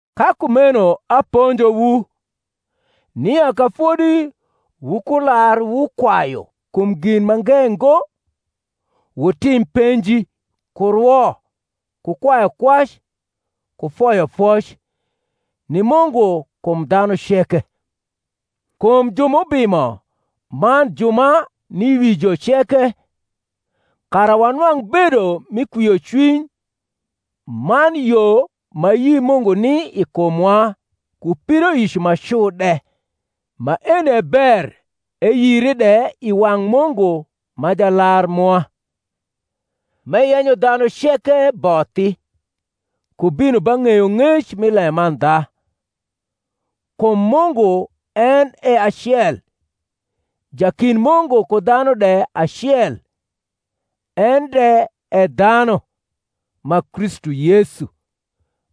Ka kumeno aponjowu, nia ka fodi wukularwukwayu kum gin mange ngo, wutim penji, ku rwo, ku kwayukwac, ku foyofoc, ni Mungu kum dhanu ceke; kum ju m’ubimo man ju ma ni wi jo ceke; kara wanwang’ bedo mi kwiocwiny man yo ma ayi Mungu ni i kumwa ku pidoic ma cu de. Maeni e ber eyire de i wang’ Mungu ma. Jalar mwa; m’eyenyo dhanu ceke bothi, ku bino ba ng’eyong’ec mi lemandha. Kum Mungu en e acel, jakind Mungu ku dhanu de acel, en de e dhanu, ma Kristu Yesu,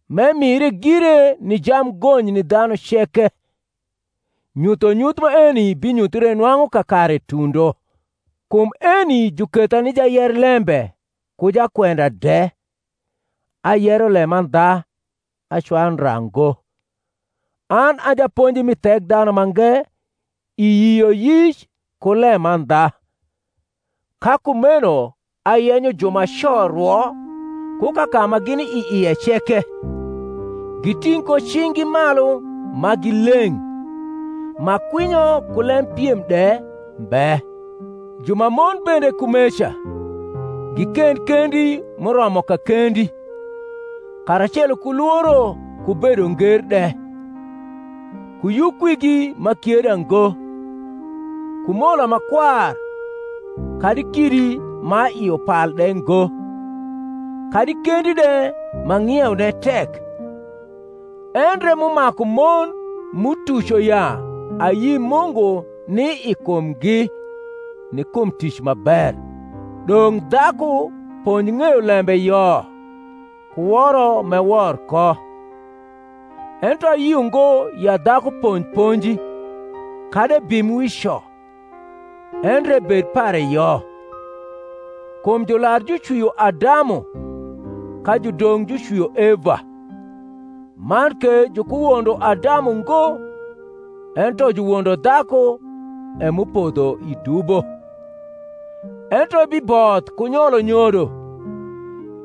m’emire gire ni jamgony ni dhanu ceke; nyuthonyuth maeni binyuthre nwang’u kakare tundo; kum eni juketha ni jayerlembe ku jakwenda de (ayero lemandha, acwayu ndra ngo), an a japonji mi Thekdhanumange i yioyic ku lemandha. Ka kumeno ayenyo jumaco rwo ku kaka ma gini i ie ceke, giting’ ko cing’gi malu ma gi leng’, ma kwinyo ku lem piem de mbe. Jumamon bende kumeca, gikend kendi m’uromo kakendi, karacelo ku lworo ku bedo nger de; ku yukwigi m’akieda ngo, ku mola ma kwar kadi kidi ma i upal de ngo, kadi kendi de ma ng’ieune tek; endre (m’umaku mon m’utuco ya ayi Mungu ni i kumgi) ni kum tic ma ber. Dong’ dhaku ponj ng eyo lembe yo ku woro m’ewor ko. Ento ayio ngo ya dhaku ponj ponji, kadi ebim wi co, endre ebed pare yo. Kum jular jucwio Adamu, ka judong’ jucwio Eva; man ke jukuwondo Adamu ngo, ento juwondo dhaku e m’upodho i dubo: ento ebiboth ku nyolo nyodo,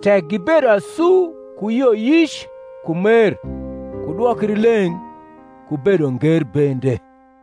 tek gibedo asu ku yioyic ku mer ku dwokrileng’ ku bedonger bende.